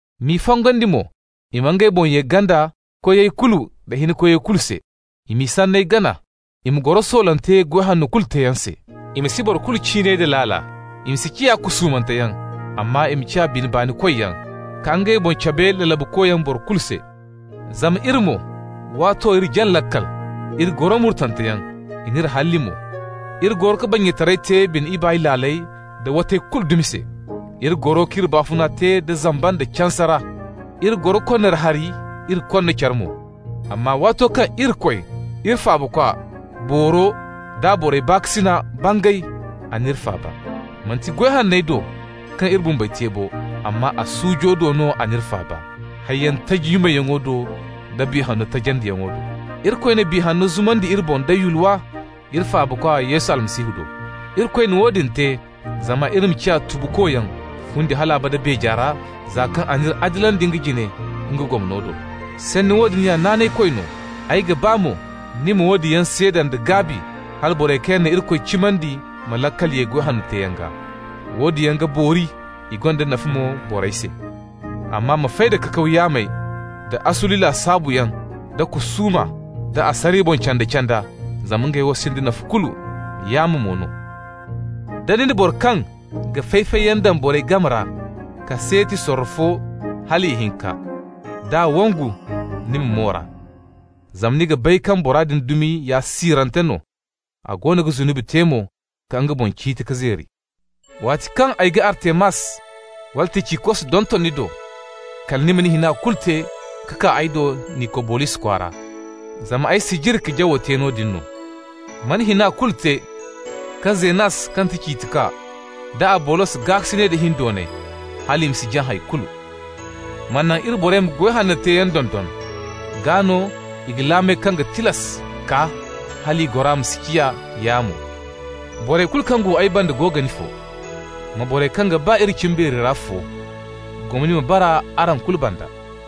M'i fongandi mo i ma ngey boŋ ye ganda koyey kulu nda hinkoyey kulu se. I m'i sanney gana, i ma goro soolante goy hanno kulu teeyaŋ se. I ma si boro kulu ciinay da laala, i ma si ciya kusuumanteyaŋ, amma i ma ciya bine baanikoyyaŋ, ka ngey boŋ cabe lalabukoyaŋ boro kulu se. Zama iri mo, waato iri jaŋ laakal, iri goro murtanteyaŋ, i n'iri halli mo. Iri goro ka bannyataray te bine ibaay laaley da watay kulu dumi se. Iri goro k'iri baafuna te zamba nda canse ra. Iri goro konnaari hari, iri konna care mo. Amma waato kaŋ Irikoy, iri Faabakwa booro d'a borey se baakasina bangay, a n'iri faaba. Manti goy hanney do kaŋ iri bumbey te bo, amma a suujo do no a n'iri faaba, hayyaŋ taji nyumayyaŋo do da Biya Hanno tajandiyaŋo do. Irikoy na Biya Hanno zumandi iri boŋ da yulwa iri Faabakwa Yesu Almasihu do. Irikoy na woodin te zama iri ma ciya tubukoyaŋ fundi hal abada beeja ra, za kaŋ a n'iri adilandi nga jine nga gomno do. Sanni woodin ya naanaykoy no. Ay ga ba mo ni ma woodin yaŋ seeda nda gaabi hala borey kaŋ yaŋ na Irikoy cimandi ma laakal ye goy hanno teeyaŋ gaa. Woodin yaŋ ga boori. I gonda nafa mo borey se. Amma ma fay da kakaw yaamey da asuli lasaabuyaŋ da kusuuma, da asariya boŋ canda-canda, zama ngey wo sinda nafa kulu, yaamo mo no. Da ni na boro kaŋ ga fay-fayyaŋ daŋ borey game ra kaseeti sorro fo hal ihinka, d'a wangu ni ma moor'a. Zama ni ga bay kaŋ bora din dumi ya siirante no, a goono ga zunubi te mo, ka nga boŋ ciiti ka zeeri. Waati kaŋ ay ga Artemas wala Ticikos donton ni do, kala ni ma ni hina kulu te ka kaa ay do Nikobolis kwaara, zama ay sijiri ka jawo te noodin no. Ma ni hina kulu te ka Zenas kaŋ ga ti ciitikwa, da Abolos gaakasinay da hindoonay hal i ma si jaŋ hay kulu. Ma naŋ iri borey ma goy hanno teeyaŋ dondon. Gaa no i ga laamey kaŋ ga tilas kaa hal i gora ma si ciya yaamo. Borey kulu kaŋ go ay banda go ga ni fo. Ma borey kaŋ ga ba iri cimbeeri ra fo. Gomni ma bara araŋ kulu banda.